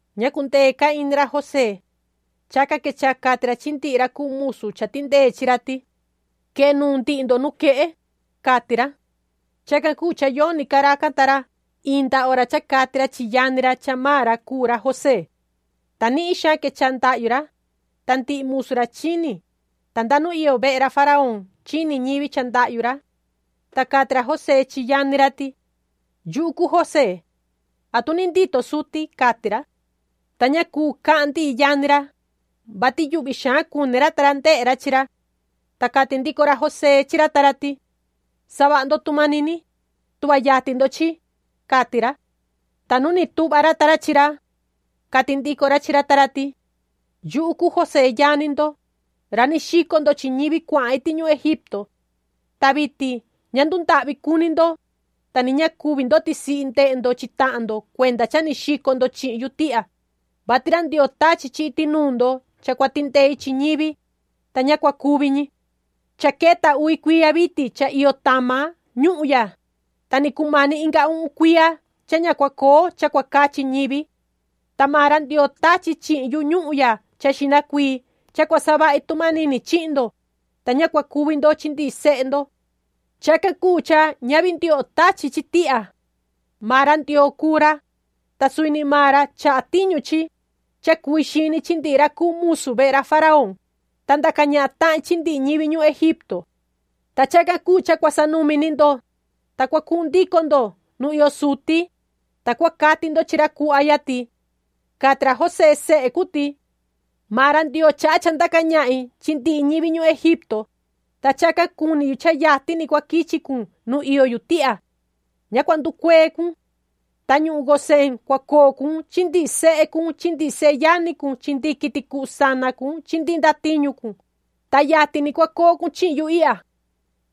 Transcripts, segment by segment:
Ña cundee ca ini ra José. Chacan quechaha cati ra chi ndihi ra cuu musu cha tindee chi ra ti:” Quee nuun ndihi ndo nuquehe”, cati ra. Chacan cuu cha yoni ca racan ta ra inda hora cha cati ra chi yani ra cha maan ra cuu ra José. Ta nihin xaan quechaha ndahyu ra, ta ndihi musu ra chini, ta nda nu iyo vehe ra faraón chini ñivi cha ndahyu ra. Ta cati ra José chi yani ra ti: ―Yuhu cuu José. ¿Atu ni ndito suti? ―cati ra. Ta ña cuu cahan ndihi yani ra, vati yuhvi xaan cuni ra ta ra ndehe ra chi ra. Ta cati ndico ra José chi ra ta ra ti: ―Savaha ndo tu manini, tuhva yatin ndo chi ―cati ra. Ta nu ni tuhva ra ta ra chi ra, cati ndico ra chi ra ta ra ti: ―Yuhu cuu José yani ndo, ra ni xico ndo chi ñivi cuahan iti ñuhun Egipto. Ta vitin ña ndundahvi cuni ndo, ta ni ña cuvi ndo tisihi ndehe ndo chi tahan ndo cuenda cha ni xico ndo chi tihya, vati ra Ndioo tachi chi iti nuun ndo cha cua tindei chi ñivi, ta ña cua cuvi ñi. Cha queta uvi cuiya vitin cha iyo tama ñuhun ya, ta ni cumani inga uhun cuiya cha ña cua coo cha cua cachi ñivi. Ta maan ra Ndioo tachi chihin yu ñuhun ya cha xihna cuii cha cua savahi tu manini chihin ndo, ta ña cua cuvi ndo chi ndihi sehe ndo. Chacan cuu cha ñavi ndioho tachi chi tihya. Maan ra Ndioo cuu ra, ta suvi ni maan ra chaha tiñu chi, cha cui xini chi ndihi ra cuu musu vehe ra faraón, ta ndaca ñahan tahin chi ndihi ñivi ñuhun Egipto. Ta chacan cuu cha cua sanumi ni ndo, ta cua cuhun ndico ni ndo nu iyo suti, ta cua cati ndo chi ra cuhva ya ti: ‘Cati ra José sehe cun ti: Maan ra Ndioo chaha cha ndaca ñahin chi ndihi ñivi ñuhun Egipto, ta chacan cuni yu cha yatin ni cua quichi cun nu iyo yu tihya. Ña cua nducuee cun. Ta ñuhun Gosén cua coo cun chi ndihi sehe cun chi ndihi seyani cun chi ndihi quiti cuhu sana cun chi ndihi ndatiñu cun, ta yatin ni cua coo cun chihin yu ihya.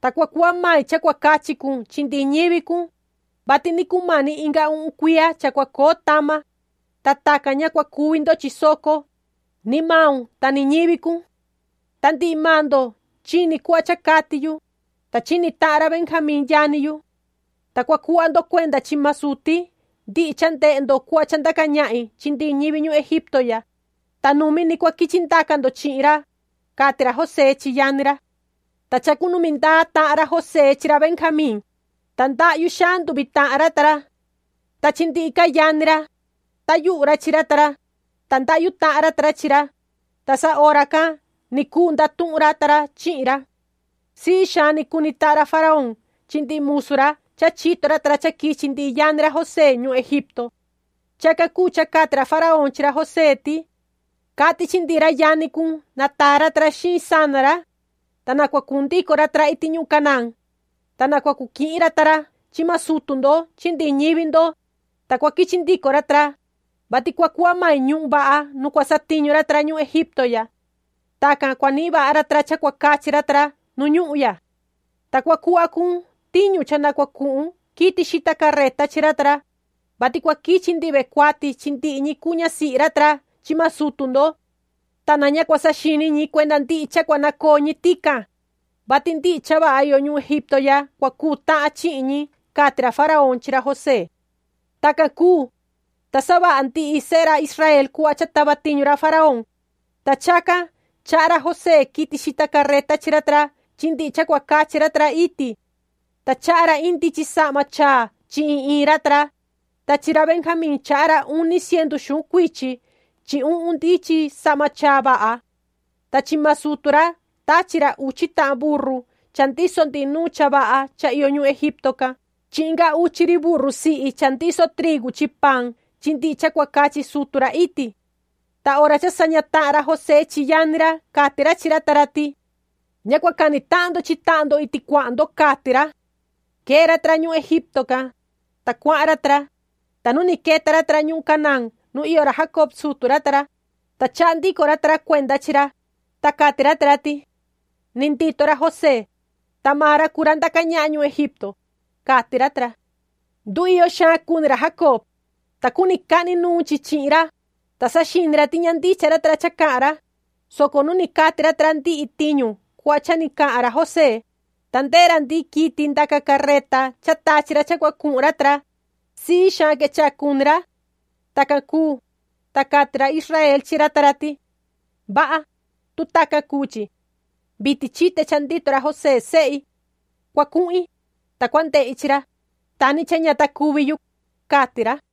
Ta cua cuhva mai cha cua cachi cun chi ndihi ñivi cun, vati ni cumani inga uhun cuiya cha cua coo tama, ta tacan ña cua cuvi ndo chi soco, ni maun ta ni ñivi cun’. Ta ndihi maan ndo chini cuhva cha cati yu, ta chini tahan ra Benjamín yani yu. Ta cua cuhva ndo cuenda chi maan suti ndihi cha ndehe ndo cuhva cha ndaca ñahin chi ndihi ñivi ñuhun Egipto ya, ta numi ni cua quichi ndaca ndo chi ra ―cati ra José chi yani ra. Ta chacunumi ndaa tahan ra José chi ra Benjamín, ta ndahyu xaan nduvi tahan ra ta ra. Ta chi ndihi ca yani ra, tayuhu ra chi ra ta ra, ta ndahyu tahan ra ta ra chi ra, ta sa hora can ni cuu ndatuhun ra ta ra chihin ra. Sii xaan ni cuni tahan ra faraón chi ndihi musu ra cha chito ra ta ra cha quichi ndihi yani ra José ñuhun Egipto. Chacan cuu cha cati ra faraón chi ra José ti: ―Cati chi ndihi ra yani cun na taa ra ta ra xiin sana ra, ta cua cuhun ndico ra ta ra iti ñuhun Canaán, ta na cua cu quihin ra ta ra chi maan sutu ndo chi ndihi ñivi ndo, ta cua quichi ndico ra ta ra, vati cua cuhva mai ñuhun vaha nu cua satiñu ra ta ra ñuhun Egipto ya. Tacan cua nihin vaha ra ta ra cha cua cachi ra ta ra nu ñuhun ya. Ta cua cuhva cun tiñu cha na cua cuhun quiti xita carreta chi ra ta ra, vati cua quichi ndihi ve cuati chi ndihi ñi cuu ñasihi ra ta ra chi maan sutu ndo. Ta na ña cua saxini ñi cuenda ndihi cha cua nacoo ñi tican, vati ndihi cha vaha iyo ñuhun Egipto ya cua cuu tahan chi chihin ñi ―cati ra faraón chi ra José. Tacan cuu, ta savaha ndihi sehe ra Israel cuhva cha tava tiñu ra faraón, ta chacan chaha ra José quiti xita carreta chi ra ta ra chi ndihi cha cua cachi ra ta ra iti. Ta chaha ra iin ndichin sahma chaa chi iin iin ra ta ra, ta chi ra Benjamín chaha ra uni cientu xuhun cuichi chi uhun ndichin sahma chaa vaha. Ta chi maan sutu ra tachi ra uchi tahan burru cha ndiso ndihi nuun cha vaha cha iyo ñuhun Egipto can chi inga uchi ri burru sihi cha ndiso trigu chi paan chi ndihi cha cua cachi sutu ra iti. Ta hora cha saña tahan ra José chi yani ra cati ra chi ra ta ra ti: ―Ña cua cani tahan ndo chi tahan ndo iti cuahan ndo ―cati ra. Quee ra ta ra ñuhun Egipto can, ta cuahan ra ta ra, ta nu queta ndico ra ta ra ñuhun Canaán nu iyo ra Jacob sutu ra ta ra, ta chaha ndico ra ta ra cuenda chi ra, ta cati ra ta ra ti: ‘Ni ndito ra José, ta maan ra cuu ra ndaca ñahan ñuhun Egipto’, cati ra ta ra. Nduiyo xaan cuni ra Jacob, ta cuni cahni nuun chi chi ra, ta saxini ra ti ña ndicha ra ta ra cha cahan ra, soco nu ni cati ra ta ra ndihi tiñu cuhva cha ni cahan ra José, ta ndehe ra ndihi quiti ndaca carreta cha tachi ra cha cua cuhun ra ta ra, sii xaan quechaha cuni ra. Tacan cuu, ta cati ra Israel chi ra ta ra ti: “Vaha, tu tacan cuu chi. Vitin chite cha ndito ra José sehi. Cua cuhin, ta cua ndehi chi ra, ta ni cha ña ta cuvi yu”, cati ra.